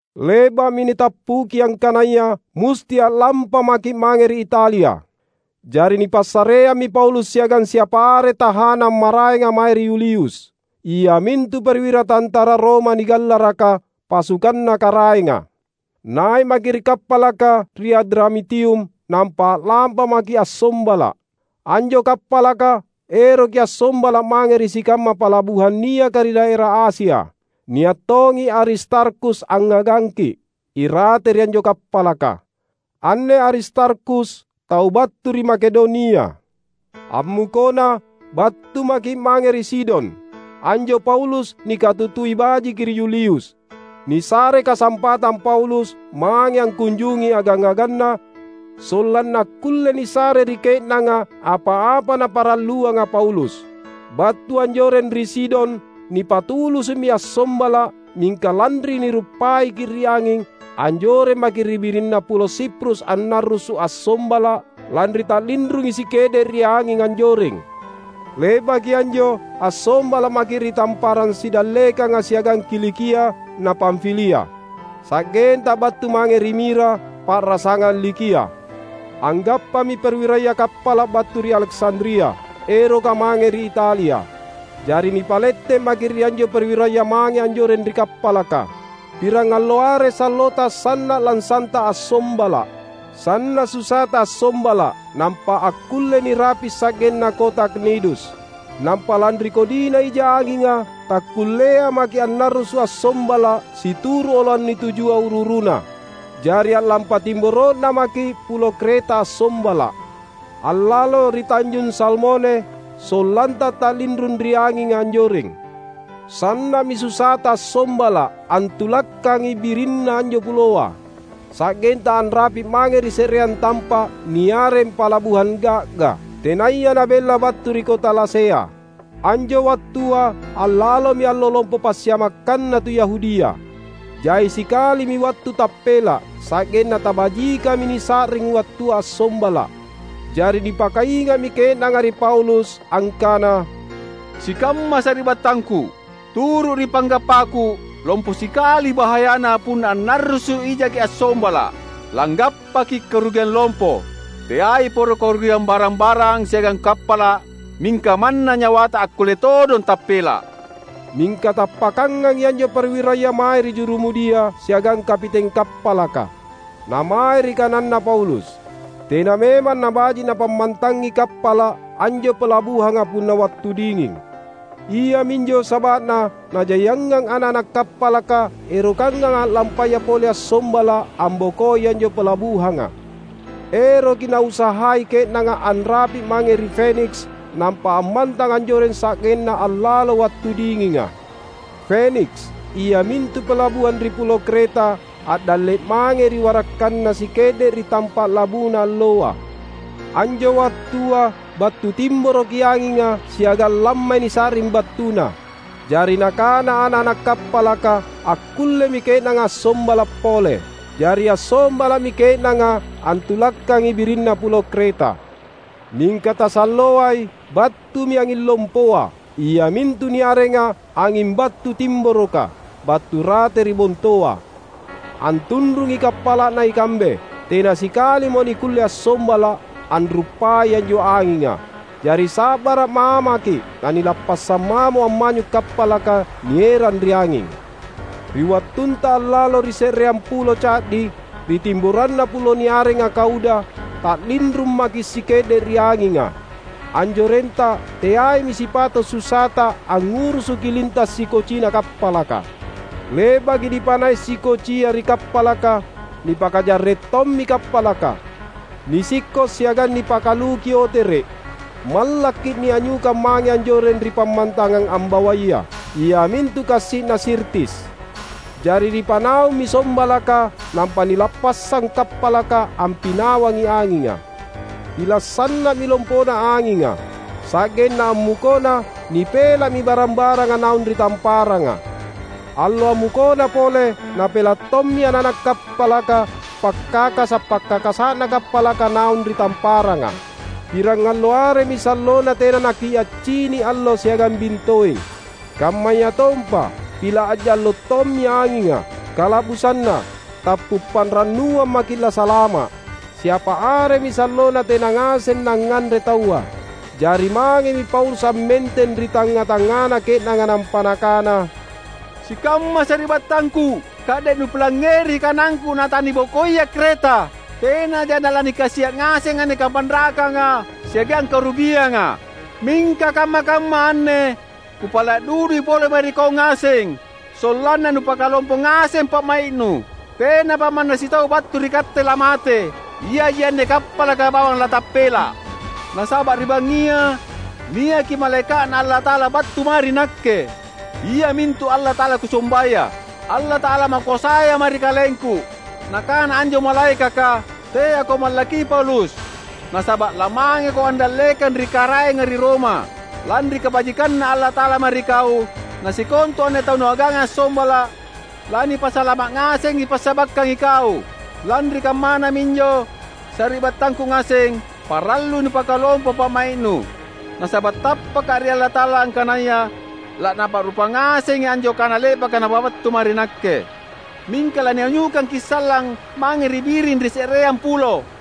Le’ba’mi nitappuki angkanaya musti a’lampa maki’ mange ri Italia. Jari nipassareammi Paulus siagang siapa are tahanang maraenga mae ri Yulius, iamintu perwira tantara Roma nigallaraka "Pasukanna Karaenga". Nai’ maki’ ri kappalaka ri Adramitium nampa a’lampa maki’ assombala’. Anjo kappalaka eroki assombala’ mange ri sikamma palabuhang niaka ri daera Asia. Nia’ tongi Aristarkhus angngagangki’ irate ri anjo kappalaka. Anne Aristarkhus tau battu ri Makedonia. Ammukona, battu maki’ mange ri Sidon. Anjo Paulus nikatutui bajiki ri Yulius. Nisarei kasampatang Paulus mange angkunjungi agang-aganna sollanna akkulle nisare ri ke’nanga apa-apa naparalluanga Paulus. Battu anjoreng ri Sidon nipatulusu’mi assombala’. Mingka lanri niruppaiki’ ri anging, anjoreng maki’ ri birinna pulo Siprus annarrusu’ assombala’, lanri ta’linrungi sike’de’ ri anging anjoreng. Le’baki anjo assombala’ maki’ ri tamparang sidallekanga siagang Kilikia na Pamfilia, sa’genta battu mange ri Mira, pa’rasangang Likia. Anggappami perwiraya kappala’ battu ri Aleksandria, eroka mange ri Italia. Jari nipalette’ maki’ ri anjo perwiraya mange anjoreng ri kappalaka. Pirangallo are sallota sanna’ lansanta assombala’. Sanna’ susata assombala’ nampa akkulle nirapi’ sa’genna kota Knidus. Nampa lanri kodina ija anginga, takkullea maki’ annarrusu’ assombala’ situru’ oloang nitujua uru-uruna. Jari a’lampa timboro’na maki’ Pulo Kreta assombala’, allalo ri Tanjung Salmone, sollanta ta’linrung ri anginga anjoreng. Sanna’mi susata assombala’ antulakkangi birinna anjo puloa; sa’genta anrapi’ mange ri se’reang tampa’ niareng Palabuhang Ga’ga, tenaya nabella battu ri kota Lasea. Anjo wattua allalomi Allo Lompo Passiamakkanna tu Yahudia. Jai sikalimi wattu tappela’, sa’genna tabajikami nisa’ring wattua assombala’. Jari nipakainga’mi ke’nanga ri Paulus, angkana, "Sikamma sari’battangku, turu’ ri panggappaku, lompo sikali bahayana punna annarrusu’ ijaki assombala’. Langgappaki’ karugiang lompo. Teai poro karugiang barang-barang siagang kappala’, mingka manna nyawata akkulle todong tappela’." Mingka tappakangangi anjo perwiraya mae ri jurumudia siagang kapiteng kappalaka, na mae ri kananna Paulus. Tena memang nabaji’ napammantangi kappala’ anjo palabuhanga punna wattu dinging. Iaminjo saba’na najaiangang ana’-ana’ kappalaka erokangang a’lampaya pole assombala’ ambokoi anjo palabuhanga. Eroki nausahai ke’nanga anrapi’ mange ri Feniks nampa ammantang anjoreng sa’genna allalo wattu dinginga. Feniks, iamintu palabuhang ri Pulo Kreta a’dalle’ mangei ri warakkanna sike’de’ ri tampa’ labuna alloa. Anjo wattua battu timboroki anginga siagang lammai nisa’ring battuna. Jari nakana ana’-ana’ kappalaka akkullemi ke’nanga assombala’ pole. Jari assombala’mi ke’nanga antulakkangi birinna Pulo Kreta. Mingka tasalloai, battumi anging lompoa — iamintu niarenga anging Battu Timboroka — battu rate ri bontoa, antunrungi kappala’na ikambe. Tena sikalimo nikkulle assombala’, anruppai anjo anginga. Jari sa’bara’ mamaki’, nanilappassang mamo ammanyu’ kappalaka nierang ri anging. Ri wattunta allalo ri se’reang pulo ca’di, ri timboranna pulo niarenga Kauda, ta’linrung maki’ sike’de’ ri anginga. Anjorenta teaimi sipato’ susata angngurusuki linta’ sikocina kappalaka. Le’baki nipanai’ sikocia ri kappalaka, nipakajarre’ tommi kappalaka; nisikko’ siagang nipakaluki otere’. Mallakki’ nianyukang mange anjoreng ri pammantangang ambawaya, iamintu kassi’na Sirtis. Jari nipanaummi sombalaka nampa nilappassang kappalaka ampinawangi anginga. Pila’ sanna’mi lompona anginga. Sa’genna ammukona nipela’mi barang-baranga naung ri tamparanga. Allo ammukona pole napela’ tommi ana’-ana’ kappalaka pakkakasa’-pakkakasa’na kappalaka naung ri tamparanga. Pirangallo aremi sallona tena nakiaccini’ allo siagang bintoeng. Kammayatompa pila’ a’jallo’ tommi anginga. Kala’busanna, tappu’ panrannuang maki’ lasalama’. Siapa aremi sallona tena ngaseng nangnganre taua. Jari mangemi Paulus ammenteng ri tangnga-tangngana ke’nanga nampa nakana, "Sikamma sari’battangku! Ka’de’ nupilangngeri kanangku natanibokoia Kreta, tenaja nalanikasia’ ngaseng anne kapanrakanga siagang karugianga. Mingka kamma-kamma anne kupala’ dudui pole mae ri kau ngaseng, sollanna nupakalompo ngaseng pa’mai’nu. Tenapa manna sitau battu ri katte lamate. Iaji anne kappalaka bawang latappela’. Nasaba’ ri bangngia niaki malaeka’Na Allata’ala battu mae ri nakke, iamintu Allata’ala kusombaya, Allata’ala makoasaya mae ri kalengku. Nakana anjo malaekaka, ‘Teako mallakki Paulus! Nasaba’ lamangeko andallekang ri Karaenga ri Roma. Lanri kabajikanNa Allata’ala mae ri kau, nasikontu anne tau nuaganga assombala’, lanipasalama’ ngasengi passabakkang ikau.’ Lanri kammana minjo, sari’battangku ngaseng, parallui nupakalompo pa’mai’nu! Nasaba’ tappaka’ ri Allata’ala angkanaya laNapa’rupa ngasengi anjo kana le’baka Napabattu mae ri nakke. Mingka lanianyukangki’ sallang mange ri biring ri se’reang pulo."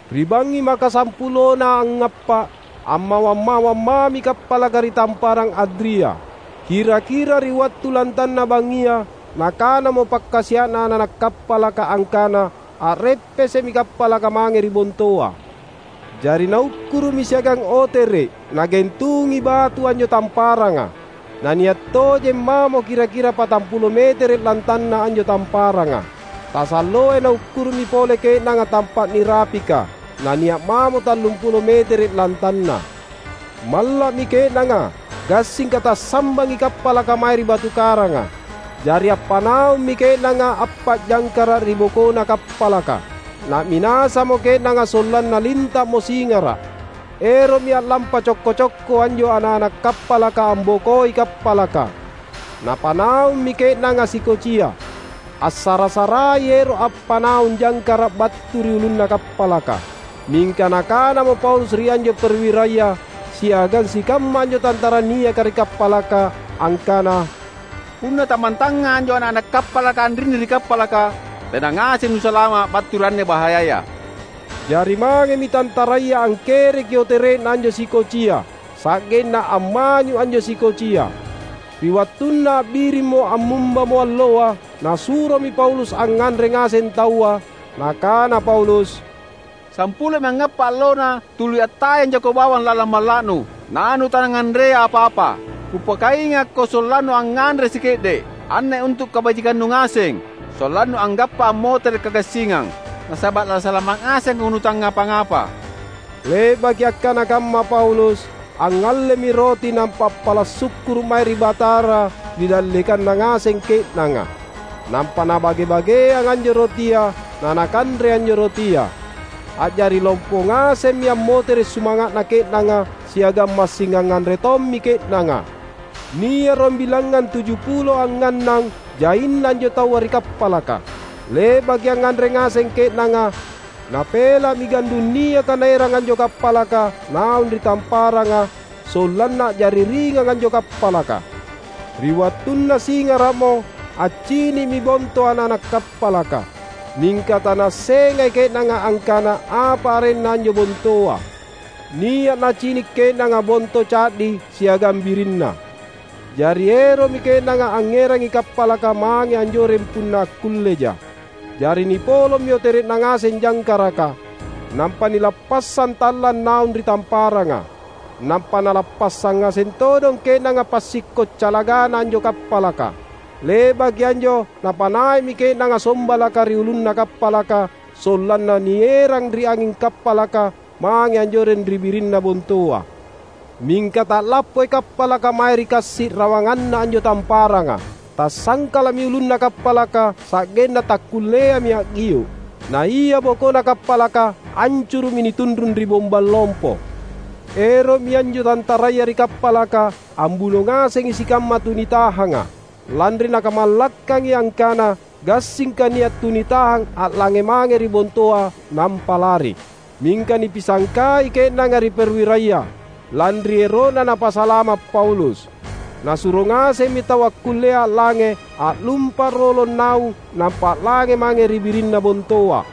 Ri bangngi makasampulona angngappa’, ammawang-mawang mami kappalaka ri Tamparang Adria. Kira-kira ri wattu lantanna bangngia nakanamo pakkasia’na ana’-ana’ kappalaka angkana a’reppese’mi kappalaka mange ri bontoa. Jari naukkuru’mi siagang otere’ nagentungi batu anjo tamparanga. Nania’ tojeng mamo kira-kira patampulo metere’ lantanna anjo tamparanga. Tasalloai naukkuru’mi pole ke’nanga tampa’ nirapika, nania’ mamo tallumpulo metere’ lantanna. Malla’mi ke’nanga gassingka tassambangi kappalaka mae ri batu karanga. Jari appanaummi ke’nanga appa’ jangkara’ ri bokona kappalaka. Na’minasamo ke’nanga sollanna linta’mo singara’. Ero’mi a’lampa cokko-cokko anjo ana’-ana’ kappalaka ambokoi kappalaka. Napanaummi ke’nanga sikocia, assara-sarai ero’ appanaung jangkara’ battu ri ulunna kappalaka. Mingka nakanamo Paulus ri anjo perwiraya siagang sikamma anjo tantara niaka ri kappalaka, angkana, "Punna tammantanga anjo ana’-ana’ kappalaka anrinni ri kappalaka, tena ngaseng nulasalama’ battu ri anne bahayaya." Jari mangemi tantaraya angkereki otere’na anjo sikocia, sa’genna ammanyu’ anjo sikocia. Ri wattunna a’birimmo ammumbamo alloa, nasuromi Paulus angnganre ngaseng taua. Nakana Paulus, "Sampulomi anggappa’ allonna tuli attayang jako bawang lalang malla’nu, nanutangnganrea apa-apa. Kupakaingakko sollannu angnganre sike’de’. Anne untu’ kabajikannu ngaseng, sollannu anggappa ammotere’ kagassingang. Nasaba’ lasalama’ ngasengko nutangngapa-apa." Le’baki akkana kamma Paulus, angngallemi roti nampa appala’ sukkuru’ mae ri Batara ri dallekanna ngaseng ke’nanga. Nampa napa’bage-bageang anjo rotia, nanakanre anjo rotia. A’jari lompo ngasemmi ammotere’ sumanga’na ke’nanga, siagang massing angnganre tommi ke’nanga. Nia’ ruambilangngang tujupulo angngannang jaina anjo taua ri kappalaka. Le’baki angnganre ngaseng ke’nanga, napela’mi gandung niaka naerang anjo kappalaka naung ri tamparanga, sollanna a’jari ringang anjo kappalaka. Ri wattunna singara’mo, accini’mi bonto ana’-ana’ kappalaka, mingka tanaassengai ke’nanga angkana apa arenna anjo bontoa. Nia’ nacini’ ke’nanga bonto ca’di siagang birinna. Jari ero’mi ke’nanga angngerangi kappalaka mange anjoreng punna akkulleja. Jari nipolommi otere’na ngaseng jangkaraka, nampa nilappassang tallang naung ri tamparanga. Nampa nalappassang ngaseng todong ke’nanga passikko’ calagana anjo kappalaka. Le’baki anjo napanai’mi ke’nanga sombalaka ri ulunna kappalaka sollanna nierang ri anging kappalaka mange anjoreng ri birinna bontoa. Mingka ta’lappoi kappalaka mae ri kassi’ rawanganna anjo tamparanga. Tassangkala’mi ulunna kappalaka sa’genna takkulleami a’gio’. Na ia bokona kappalaka ancuru’mi nitunrung ri bombang lompo. Ero’mi anjo tantaraya ri kappalaka ambuno ngasengi sikamma tunitahanga, lanri nakamallakkangi angkana gassingka nia’ tunitahang a’lange mange ri bontoa nampa lari. Mingka nipisangkai ke’nanga ri perwiraya, lanri ero’na napasalama’ Paulus. Nasuro ngasemmi tau akkullea a’lange a’lumpa’ rolong naung nampa a’lange mange ri birinna bontoa;